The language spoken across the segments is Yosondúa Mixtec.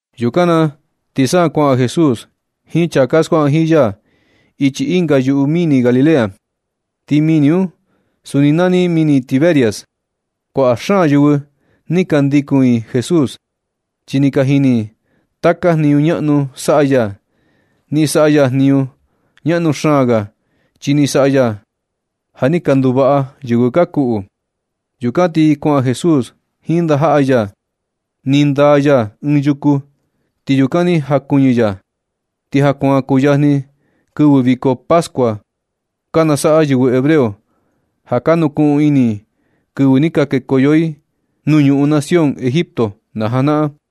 Yukan na ti sa kuaꞌan Jesús jiin chaa ka skuaꞌa jiin ya ichi ɨnga yuꞌu mini Galilea. Ti mini un suni nani mini Tiberias. Kuaꞌa xaan yɨvɨ ni ka ndikun i Jesús, chi ni ka jini i taka jniñu ñaꞌnu saꞌa ya. Ni saꞌa ya jniñu ñaꞌnu xaan ga, chi ni saꞌa ya ja ni ka nduvaꞌa yɨvɨ ka kuꞌu. Yukan ti kuaꞌan Jesús jiin ndajaꞌa ya, ni ndaa ya ɨɨn yuku, ti yukan ni jakuɨñɨ ya. Ti ja kuan kuyajni kɨvɨ viko Pascua ka nasaꞌa yɨvɨ hebreo, ja ka nukuꞌun ini i kɨvɨ ni ka kekoyo i nuu ñuꞌun nación Egipto na janaꞌan.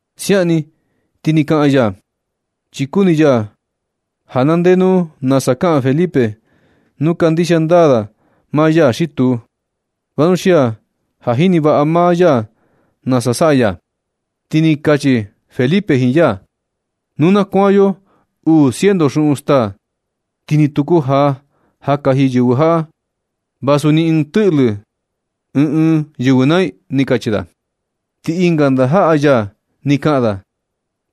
Siaꞌan ni ni kaꞌan ya, chi kuni ya ja na ndee nu nasa kaꞌan Felipe nu kandixia ndaa da maa ya xi tuu, vanuxia ja jini vaꞌa maa ya nasa saꞌa ya. Ti ni kachi Felipe jiin ya: ―Nu na kuaan yo uu ciento xuꞌun staa, ti ni tu kujaa ja kaji yɨvɨ jaꞌa, vasu ni ɨɨn tɨꞌlɨ ɨɨn ɨɨn yɨvɨ naa i ―ni kachi da. Ti ɨnga ndajaꞌa ya ni kaꞌan da,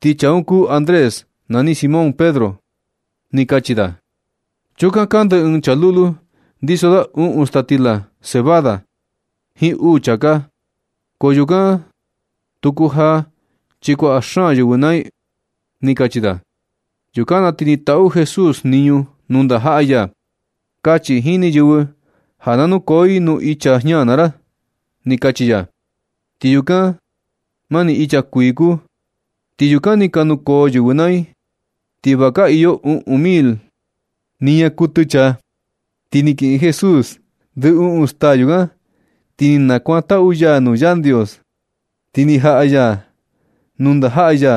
ti chaa un kuu Andrés, ñani Simón Pedro. Ti kachi da: ―Chukan kande ɨɨn chaa lulu, ndiso da uꞌun staa stila cebada jiin uu chāká. Ko yukan tu kujaa chi kuaꞌa xaan yɨvɨ naa i ―ni kachi da. Yukan na ti ni taꞌu Jesús jniñu nuu ndajaꞌa ya: ―Kachi jini yɨvɨ ja na nukoo i nuu icha jña naa ra ―ni kachi ya. Ti yukan mani icha kuii kuu, ti yukan ni ka nukoo yɨvɨ naa i. Ti va ka iyo uꞌun mil niña kuɨtɨ chaa. Ti ni kiꞌin Jesús ndɨ uꞌun staa yukan, ti ni nakuantaꞌu ya nuu Yandios. Ti ni jaꞌa ya nuu ndajaꞌa ya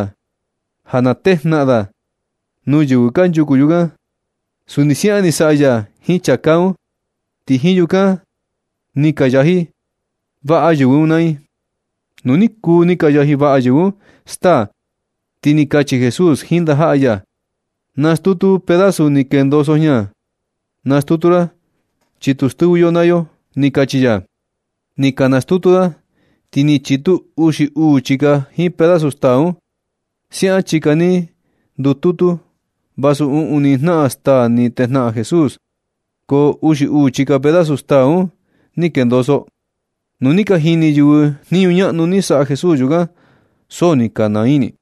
ja na tejnaꞌan da nuu yɨvɨ kanchuku yukan. Suni siaꞌan ni saꞌa ya jiin chāká un, ti jiin yukan ni ni ka yaji vaꞌa yɨvɨ un naa i. Nu ni kuu ni ka yaji vaꞌa yɨvɨ un staa, ti ni kachi Jesús jiin ndajaꞌa ya: ―Nastutu pedazu ni kendoso jña, nastutu ra chi tu stɨvɨ yo naa yo ―ni kachi ya. Ni ka nastutu da, ti ni chitu uxi uu chika jiin pedazu staa un. Siaꞌan chika ni ndututu vasu uꞌun ni jnaꞌan staa ni tejnaꞌan Jesús, ko uxi uu chika pedazu staa un ni kendoso. Nu ni ka jini yɨvɨ jniñu ñaꞌnu ni saꞌa Jesús yukan, so ni ka naa ini i,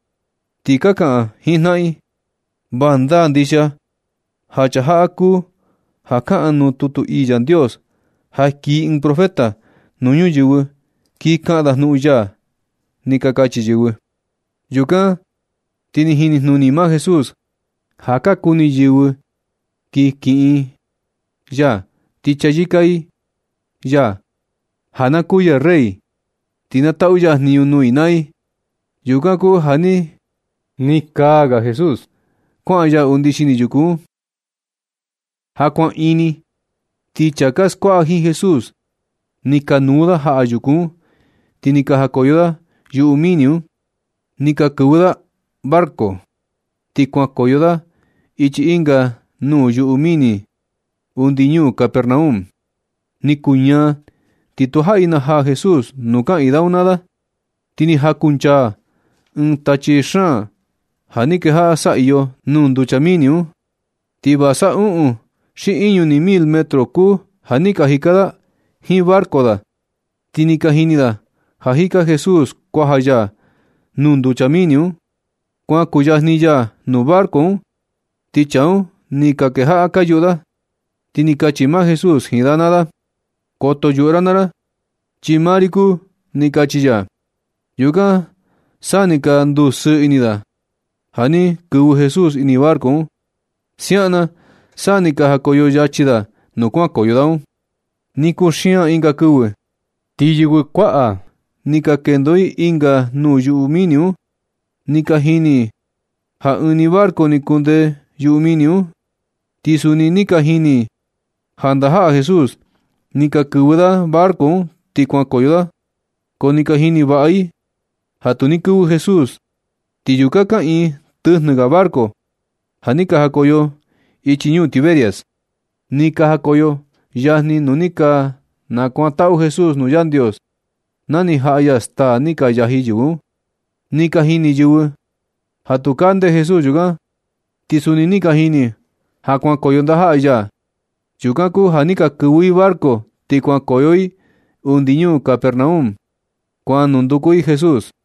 ti ka kaꞌan jiin jnaꞌan i: ―Va ndaa ndixia ja chaa jaꞌa kuu ja kaꞌan nuu tutu ii Yandios, ja kii ɨɨn profeta nuu ñuyɨvɨ, kii kaꞌan da jnuꞌun ya ―ni ka kachi yɨvɨ. Yukan ti ni jinijnuni maa Jesús ja ka kuni yɨvɨ kin kiꞌin i ya, ti chayɨka i ya ja na kuu ya rey, ti na taꞌu ya jniñu nuu i naa i. Yukan kuu ja ni kaa ga Jesús kuaꞌan ya undi xini yuku un. Ja kuan ini, ti chaa ka skuaꞌa jiin Jesús, ni ka nuu da jaꞌa yuku un, ti ni ka najakoyo da yuꞌu mini un. Ni ka kɨvɨ da barco, ti kuankoyo da ichi ɨnga nuu yuꞌu mini undi ñuu Capernaum. Ni kuu ñaa, ti tujaꞌi najaa Jesús nuu kaꞌiin da un naa da. Ti ni jakunchaa ɨɨn tachi xaan, ja ni kejaꞌa saꞌiyo nuu nducha mini un. Ti va sa uꞌun xi iñu ni mil metro kuu ja ni ka jika da jiin barco da, ti ni ka jini da jika Jesús kuaja ya nuu nducha mini un, kuan kuyajni ya nuu barco un. Ti chaa un ni kejaꞌa ka yuꞌu da. Ti ni kachi maa Jesús jiin da naa da: ―Koto yuꞌu ra naa ra chi maa ri kuu ―ni kachi ya. Yukan na sa ni ka ndusɨɨ ini da ja ni kɨvɨ Jesús ini barco un. Siaꞌan na sa ni ka jakoyo yachi da nuu kuankoyo da un. Ni kuxian ɨnga kɨvɨ, ti yɨvɨ kuaꞌa ni ka kendo i ɨnga nuu yuꞌu mini un. Ni ka jini i ja ɨɨn ni barco ni kunde yuꞌu mini un. Ti suni ni ka jini i ja ndajaꞌa Jesús ni ka kɨvɨ da barco un ti kuankoyo da. Ko ni ka jini vaꞌa i ja tu ni kɨvɨ Jesús. Ti yukan kaꞌiin tɨjnɨ ga barco ja ni ka jakoyo ichi ñuu Tiberias, ni ka jakoyo yajni nuu ni nakuantaꞌu Jesús nuu Yandios, na ni jaꞌanya staa ni ka yaji yɨvɨ un. Ni ka jini yɨvɨ ja tu kande Jesús yukan, ti suni ni ka jini i ja, ja kuankoyo ndajaꞌa ya. Yukan kuu ja ni ka kɨvɨ i barco ti kuankoyo i undi ñuu Carpernaum, kuan nunduku i Jesús.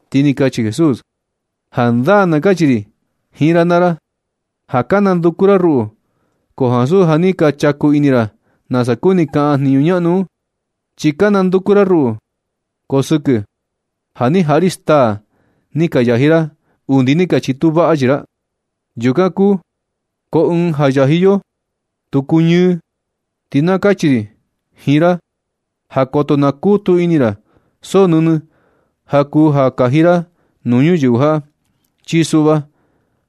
Ti ni kachi Jesús: ―Jandaa na kachi ri jiin ra naa ra ja ka nanduku ra ruꞌu, ko ansu ja ni ka chaku ini ra nasa kuni kaꞌan jniñu ñaꞌnu un, chi ka nanduku ra ruꞌu, ko sɨkɨ ja ni jaꞌa ri staa ni ka yaji ra undi ni ka chitu vaꞌa chii ra, yukan kuu. Ko ɨɨn ja yaji yo, tu kuñɨɨ. Ti na kachi ri jiin ra ja koto nakutu ini ra so nɨnɨ ja kuu ja kaji ra nuu ñuyɨvɨ jaꞌa. Chi suꞌva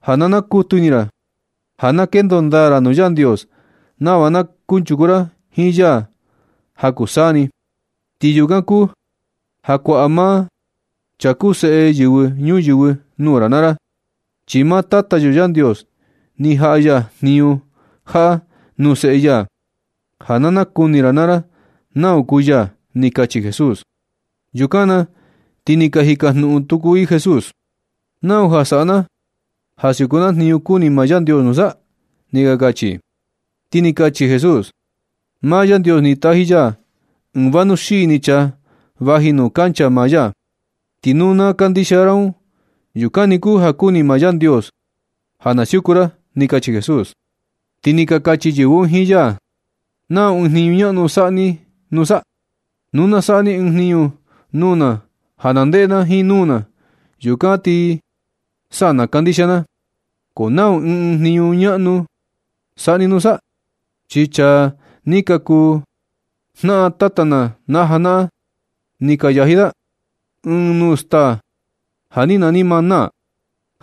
ja na nakutu ini ra ja na kendo ndaa ra nuu Yandios, nava na kunchuku ra jiin ya ja kuu saa ni. Ti yukan kuu ja kuaꞌa maa chaa kuu Seꞌe Yɨvɨ Ñuyɨvɨ nuu ra naa ra. Chi maa Tata yo Yandios, ni jaꞌa ya jniñu jaꞌa nuu Seꞌe ya ja na nakuni ra naa ra nau kuu ya ―ni kachi Jesús. Yukan na ti ni ka jikajnuꞌun tuku i Jesús: ―¿Nau ja saꞌa na ja siuku na jniñu kuni maa Yandios nusa? ―ni ka kachi i. Ti ni kachi Jesús: ―Maa Yandios ni taji ya ɨɨn vanuxii ni chaa vaji nuu kancha maa ya. Ti nu na kandixia ra un, yukan ni kuu ja kuni maa Yandios ja na siuku ra ―ni kachi Jesús. Ti ni ka kachi yɨvɨ un jiin ya: ―¿Nau ɨɨn jniñu ñaꞌnu saꞌa ni nusa? Nu na saꞌa ni ɨɨn jniñu nuu na ja na ndeꞌe na jiin nuu na, yukan ti sa na kandixia na. ¿Ko nau ɨɨn ɨɨn jniñu ñaꞌnu saꞌa ni nusa? Chi chaa ni ka kuu jnaꞌan tata na na janaꞌan, ni ka yaji da ɨɨn nuu staa ja ni nani “maná”,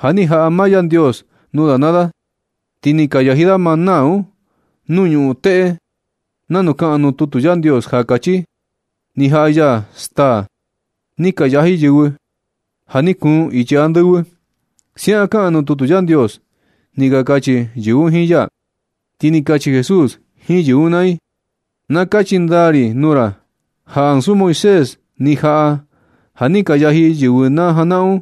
ja ni jaꞌa maa Yandios nuu da naa da. Ni ka yaji da maná un nuu ñuꞌun teꞌe nanu kaꞌan nuu tutu Yandios, ja kachi: “Ni jaꞌa ya staa ni ka yaji yɨvɨ. Ja ni kuun ichi andɨvɨ.” Siaꞌan kaꞌan nuu tutu Yandios ―ni ka kachi yɨvɨ un jiin ya. Ti ni kachi Jesús jiin yɨvɨ un naa i: ―Na kachi ndaa ri nuu ra ja ansu Moisés ni jaꞌa ja ni ka yaji yɨvɨ na janaꞌan un,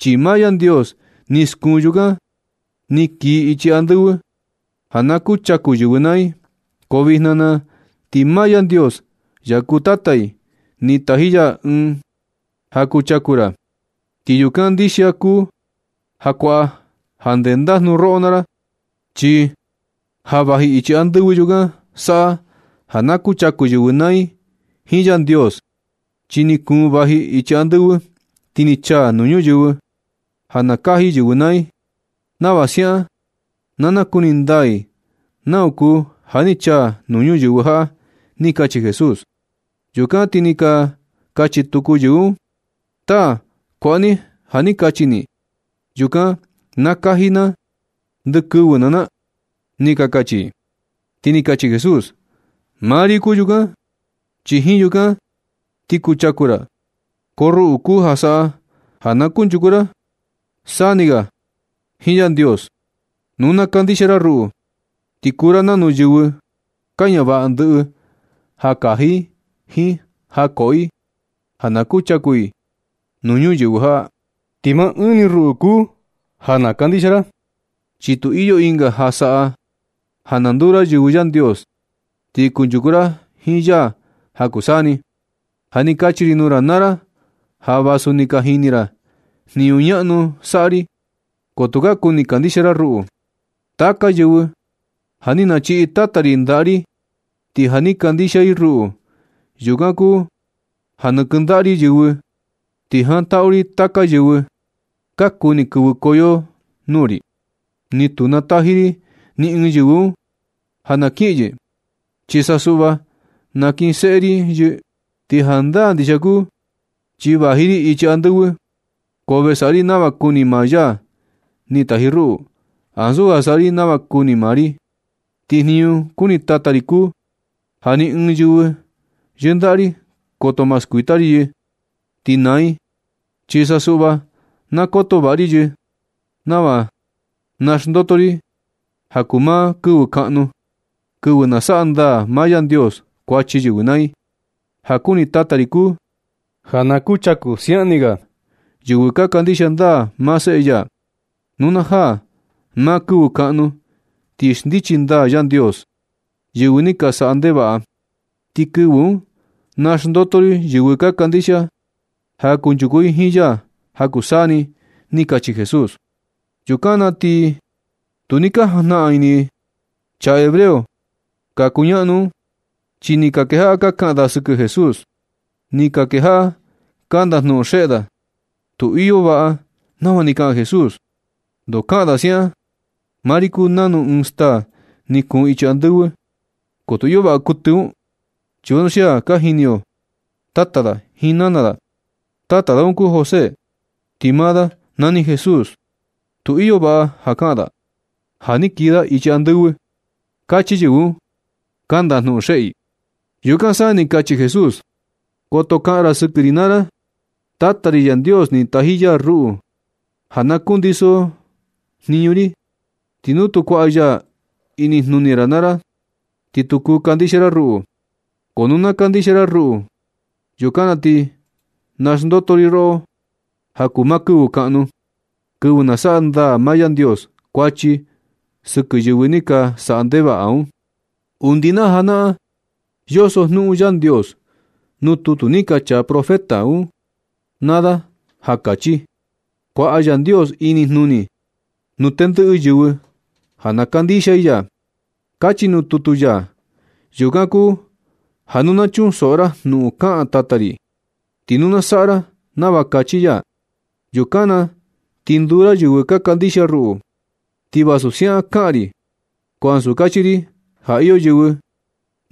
chi maa Yandios ni skuun yukan ni kii ichi andɨvɨ ja na kuchaku yɨvɨ naa i. Ko vijna na ti maa Yandios, ya kuu Tata i, ni taji ya ɨɨn ja kuchaku ra, ti yukan ndixia kuu ja kuaꞌa ja ndendajnu roꞌo naa ra. Chi ja vaji ichi andɨvɨ, yukan saꞌa ja na kuchaku yɨvɨ naa i jiin Yandios. Chi ni kuun vaji ichi andɨvɨ ti ni chaa nuu ñuyɨvɨ ja na kaji yɨvɨ naa i, nava siaꞌan na nakuni ndaa i nau kuu ja ni chaa nuu ñuyɨvɨ jaꞌa ―ni kachi Jesús. Yukan ti ni ka kachi tuku yɨvɨ un: ―Taa, kuaꞌa ni ja ni kachi ni yukan na kaji na ndɨ kɨvɨ naa na ―ni ka kachi i. Ti ni kachi Jesús: ―Maa ri kuu yukan, chi jiin yukan ti kuchaku ra. Ko ruꞌu kuu ja saꞌa ja na kunchuku ra saa ni ga jiin Yandios. Nu na kandixia ra ruꞌu, ti kuu ra nanu yɨvɨ ka ñavaꞌa ndɨꞌɨ ja kaji i jiin ja koꞌo i ja na kuchaku i nuu ñuyɨvɨ jaꞌa. Ti maa ɨɨn ni ruꞌu kuu ja na kandixia ra. Chi tu iyo ɨnga ja saꞌa ja na nduu ra yɨvɨ Yandios ti kunchuku ra jiin ya ja kuu saa ni. Ja ni kachi ri nuu ra naa ra ja vasu ni ka jini ra jniñu ñaꞌnu saꞌa ri, ko tu ka kuni kandixia ra ruꞌu. Taka yɨvɨ ja ni nachiꞌi Tata ri ndaꞌa ri ti ja ni kandixia i ruꞌu, yukan kuu ja nakɨndaꞌa ri yɨ. Ti jantaꞌu ri taka yɨvɨ ka kuni kɨvɨkoyo nuu ri, ti tu nataji ri ni ɨɨn yɨvɨ un ja na kiꞌin yɨ, chi sa suꞌva nakinseꞌe ri yɨ. Ti jandaa ndixia kuu chi vaji ri ichi andɨvɨ, ko ve saꞌa ri nava kuni maa ya ni taji ruꞌu, ansu ja saꞌa ri nava kuni maa ri. Ti jniñu kuni Tata ri kuu ja ni ɨɨn yɨvɨ yɨndaꞌa ri, koto ma skuita ri yɨ, ti naa i. Chi sa suꞌva na koto vaꞌa ri yɨ nava naxndoto ri i ja kuu maa kɨvɨ kaꞌnu, kɨvɨ nasaꞌa ndaa maa Yandios kuachi yɨvɨ naa i. Ja kuni Tata ri kuu ja na kuchaku siaꞌan ni ga yɨvɨ ka kandixia ndaa maa Seꞌe ya. Nu na jaa maa kɨvɨ kaꞌnu ti xndichi ndaa Yandios yɨvɨ ni ka saꞌa ndevaꞌa. Ti kɨvɨ un naxndoto ri yɨvɨ ka kandixia ja kunchuku i jiin ya ja kuu saa ni ―ni kachi Jesús. Yukan na ti tu ni ka jajnaꞌan ini chaa hebreo ka kakuñaꞌnu un. Chi ni ka kejaꞌa ka kaꞌan da sɨkɨ Jesús. Ni ka kejaꞌa ka ndajnuꞌun xeꞌe da: ―Tu iyo vaꞌa nava ni kaꞌan Jesús, ndoo kaꞌan da siaꞌan: “Maa ri kuu nanu ɨɨn staa ni kuun ichi andɨvɨ?” Ko tu iyo vaꞌa kuɨtɨ un. Chi vanuxia ka jini yo tata da, jiin nana da. Tata da un kuu José, ti maa da nani Jesús. Tu iyo vaꞌa ja kaꞌan da ja ni kii da ichi andɨvɨ ―kachi yɨvɨ un, ka ndajnuꞌun xeꞌe i. Yukan sa ni kachi Jesús: ―Koto kaꞌan ra sɨkɨ ri naa ra. Tata ri Yandios, ni taji ya ruꞌu ja na kundiso jniñu ri. Ti nu tu kuaꞌa ya inijnuni ra naa ra ti tu kuu kandixia ra ruꞌu. Ko nu na kandixia ra ruꞌu, yukan na ti naxndoto ri roꞌo ja kuu maa kɨvɨ kaꞌnu, kɨvɨ nasaꞌa ndaa maa Yandios kuachi sɨkɨ yɨvɨ ni ka saꞌa ndevaꞌa un. Undi na janaꞌan, yoso jnuꞌun Yandios nuu tutu ni ka chaa profeta un naa da ja kachi: “Kuaꞌa Yandios inijnuni nuu tendɨꞌɨ yɨvɨ ja na kandixia i ya”, kachi nuu tutu ya. Yukan kuu ja nu na chunsoꞌo ra jnuꞌun kaꞌan Tata ri, ti nu na saꞌa ra nava kachi ya, yukan na ti nduu ra yɨvɨ ka kandixia ruꞌu. Ti vasu siaꞌan kaꞌan ri, ko ansu kachi ri ja iyo yɨvɨ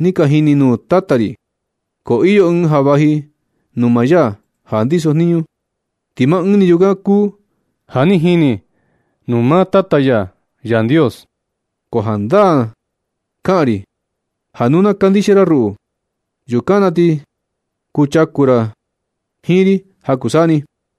ni ka jini nuu maa Tata ri. Ko iyo Ɨɨn ja vaji nuu maa ya ja ndiso jniñu. Ti maa Ɨɨn ni yukan kuu ja ni jini nuu maa Tata ya Yandios. Ko jandaa kaꞌan ri, ja nu na kandixia ra ruꞌu, yukan na ti kuchaku ra jiin ri ja kuu saa ni.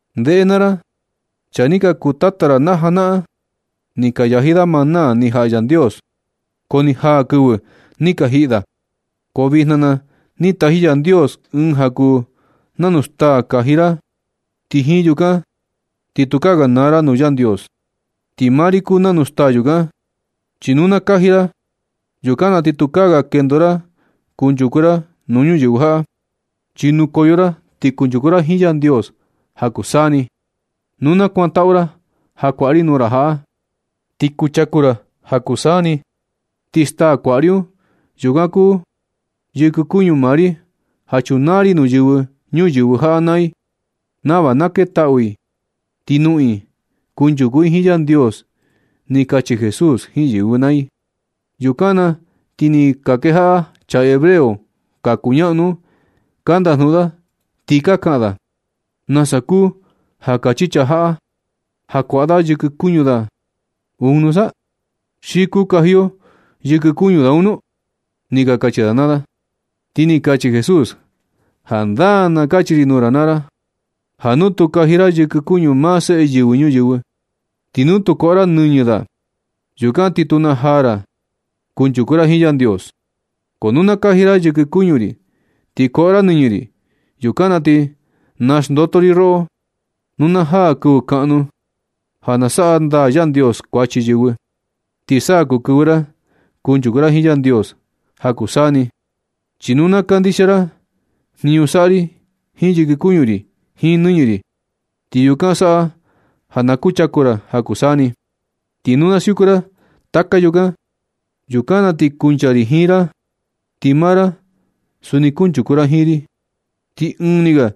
Ndeꞌe naa ra. Chaa ni ka kuu tata ra na janaꞌan, ni ka yaji da maná ni jaꞌa Yandios, ko ni jaa kɨvɨ ni ka jiꞌi da. Ko vijna na ti ni taji Yandios Ɨɨn ja kuu nanustaa kaji ra, ti jiin yukan na ti tukaa ga naa ra nuu Yandios. Ti maa ri kuu nanu staa yukan, chi nu na kaji ra, yukan na ti tukaa ga kendo ra kunchuku ra nuu ñuyɨvɨ jaꞌa, chi nukoyo ra ti kunchuku ra jiin Yandios ja kuu saa ni. Nu na kuantaꞌu ra ja kuaꞌa ri nuu ra jaꞌa, ti kuchaku ra ja kuu saa ni. Ti staa kuaꞌa ri un, yukan kuu yɨkɨ kuñu maa ri ja chunaa ri nuu yɨvɨ ñuyɨvɨ jaꞌa naa i, nava na ketaꞌu i ti noꞌon i kunchuku i jiin Yandios ―ni kachi Jesús jiin yɨvɨ naa i. Yukan na ti ni ka kejaꞌa chaa hebreo ka kuñaꞌnu un ka ndajnuꞌun da, ti ka kaꞌan da: ―¿Nasa kuu ja kachi chaa jaꞌa ja kuaꞌa da yɨkɨ kuñu da un nusa? ¿Xi kuu kaji yo yɨkɨ kuñu da un nu? ―ni ka kachi da naa da. Ti ni kachi Jesús: ―Jandaa na kachi ri nuu ra naa ra, ja nu tu kaji ra yɨkɨ kuñu maa Seꞌe Yɨvɨ Ñuyɨvɨ, ti nu tu koꞌo ra nɨñɨ da, yukan ti tu najaa ra ja kunchuku ra jiin Yandios. Ko nu na kaji ra yɨkɨ kuñu ri, ti koꞌo ra nɨñɨ ri, yukan na ti, naxndoto ri roꞌo nu najaa kɨvɨ kaꞌnu ja na saꞌa ndaa Yandios kuachi yɨvɨ, ti sa kuu kɨvɨ ra ti kunchuku ra jiin Yandios ja kuu saa ni. Chi nu na kandixia ra jniñu saꞌa ri jiin yɨkɨ kuñu ri jiin nɨñɨ ri. Ti yukan saꞌa ja na kuchaku ra ja kuu saa ni. Nu na siuku ra taka yukan, yukan na ti kuncha ri jiin ra, ti maa ra suni kunchuku ra jiin ri, ti ɨɨn ni ga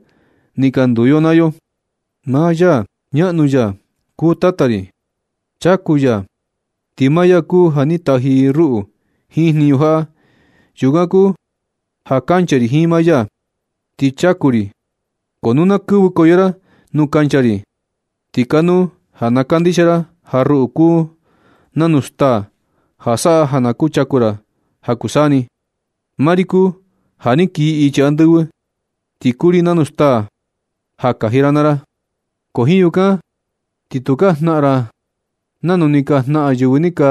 ni ka nduu yo naa yo. Maa ya ñaꞌnu, ya kuu Tata ri, chaku ya. Ti maa ya kuu ja ni taji ruꞌu jiin jniñu jaꞌa. Yukan kuu ja kancha ri jiin maa ya, ti chaku ri. Ko nu na kɨvɨkoyo ra nu kancha ri, ti kanuu ja na kandixia ra ja ruꞌu kuu nanu staa, ja saꞌa ja na kuchaku ra ja kuu saa ni. Maa ri kuu ja ni kii ichi andɨvɨ, ti kuu ri nanu staa ja kaji ra naa ra, ko jiin yukan ti tukaa jnaꞌan ra nanu ni ka jnaꞌan yɨvɨ ni ka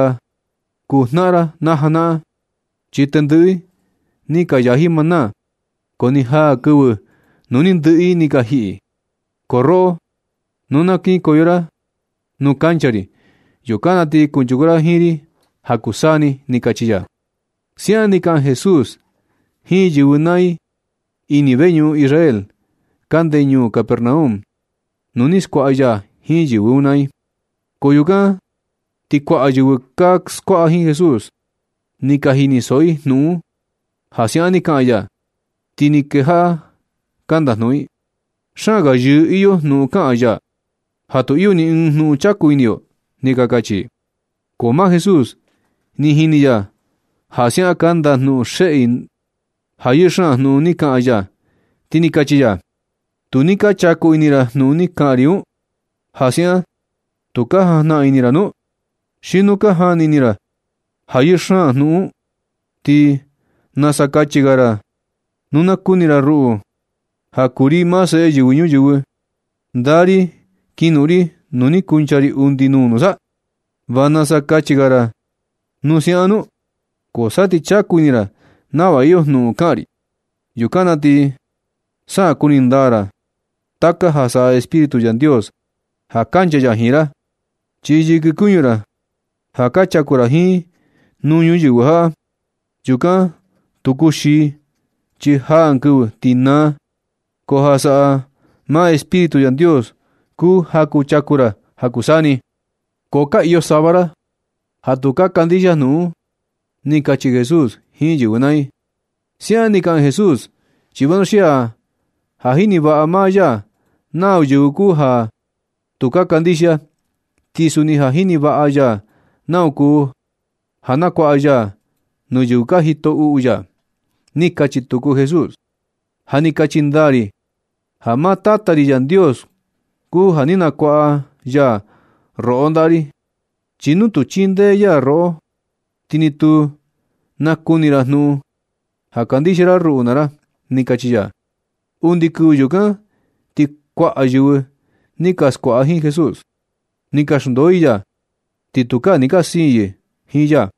kuu jnaꞌan ra na janaꞌan. Chi tendɨꞌɨ i ni ka yaji maná, ko ni jaa kɨvɨ nu ni ndɨꞌɨ i ni ka jiꞌi. Ko roꞌo, nu na kinkoyo ra nuu kancha ri, yukan na ti kunchuku ra jiin ri ja kuu saa ni ―ni kachi ya. Siaꞌan ni kaꞌan Jesús jiin yɨvɨ naa i ini veñuꞌun Israel kande ñuu Capernaum nuu ni skuaꞌa ya jiin yɨvɨ un naa i. Ko yukan na ti kuaꞌa yɨvɨ ka skuaꞌa jiin Jesús, ni ka jinisoꞌo i jnuꞌun un ja siaꞌan ni kaꞌan ya. Ti ni kejaꞌa ka ndajnuꞌun i: ―Xaan ga yɨɨ iyo jnuꞌun kaꞌan ya, ja tu iyo ni ɨɨn jnuꞌun chaku ini yo ―ni ka kachi i. Ko maa Jesús, ni jini ni ya ja siaꞌan ka ndajnuꞌun xeꞌe i ja yɨɨ xaan jnuꞌun ni kaꞌan ya, ti ni kachi ya: ―Tu ni ka chaku ini ra jnuꞌun ni kaꞌan ri un. ¿Ja siaꞌan tu ka jajnaꞌan ini ra nu? Xi nu ka jani ini ra ja yɨɨ xaan jnuꞌun un, ti ¿nasa kachi ga ra nu na kuni ra ruꞌu, ja kuu ri maa Seꞌe Yɨvɨ Ñuyɨvɨ, ndaa ri kinoꞌon ri nuu ni kuncha ri undi nuu nusa? ¿Va nasa kachi ga ra nu siaꞌan nu? Ko sa ti chaku ini ra nava iyo jnuꞌun kaꞌan ri, yukan na ti sa kuni ndaa ra taka ja saꞌa Espíritu Yandios ja kancha ya jiin ra. Chi yɨkɨ kuñu ra ja ka chaku ra jiin nuu ñuyɨvɨ jaꞌa, yukan tu kuxii chi jaa ɨɨn kɨvɨ ti naa. Ko ja saꞌa maa Espíritu Yandios kuu ja na kuchaku ra ja kuu saa ni. Ko ka iyo sava ra ja tu ka kandixia jnuꞌun un ―ni kachi Jesús jiin yɨvɨ naa i. Siaꞌan ni kaꞌan Jesús chi vanuxia ja jini vaꞌa maa ya nau yɨvɨ kuu ja tu ka kandixia, ti suni ja jini vaꞌa ya nau kuu ja nakuaꞌa ya nuu yɨvɨ ka jito uꞌu ya. Ni kachi tuku Jesús: ―Ja ni kachi ndaa ri ja maa Tata ri Yandios kuu ja ni nakuaꞌa ya roꞌo ndaꞌa ri. Chi nu tu chindee ya roꞌo, ti ni tu nakuni ra jnuꞌun ja kandixia ra ruꞌu naa ra ―ni kachi ya. Undi kɨvɨ yukan ti kuaꞌa yɨvɨ ni ka skuaꞌa jiin Jesús, ni ka xndoo i ya. Ti tukaa ni ka siin yɨ jiin ya.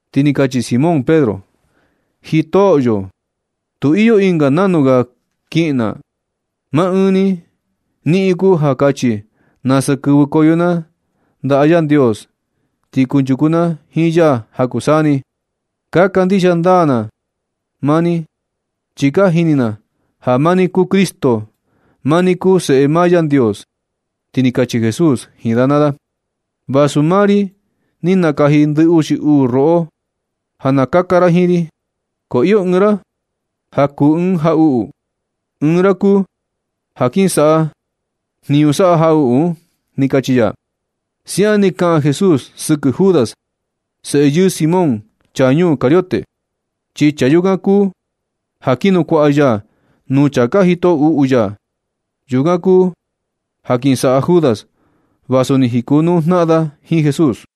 Ti ni kachi Simón Pedro: ―Jitoꞌyo. Tu iyo ɨnga nanu ga kiꞌin na. Maa ɨɨn ni niꞌin kuu ja kachi nasa kɨvɨkoyo na ndaꞌa Yandios, ti kunchuku na jiin ya ja kuu saa ni. Ka kandixia ndaa na maa ni, chi ka jini na ja maa ni kuu Cristo. Maa ni kuu Seꞌe maa Yandios. Ti ni kachi Jesús jiin da naa da: ―Vasu maa ri ni nakaji ndɨ uxi uu roꞌo ja na kaka ra jiin ri, ko iyo ɨɨn ra ja kuu ɨɨn jaꞌuꞌu. Ɨɨn ra kuu ja kin saꞌa jniñu saꞌa jaꞌuꞌu un ―ni kachi ya. Siaꞌan ni kaꞌan Jesús sɨkɨ Judas, seꞌe yɨɨ Simón, chaa ñuu Cariote, chi chaa yukan kuu ja kin nukuaꞌa ya nuu chaa ka jito uꞌu ya. Yukan kuu ja kin saꞌa Judas vasu ni jikonuu jnaꞌan da jiin Jesús.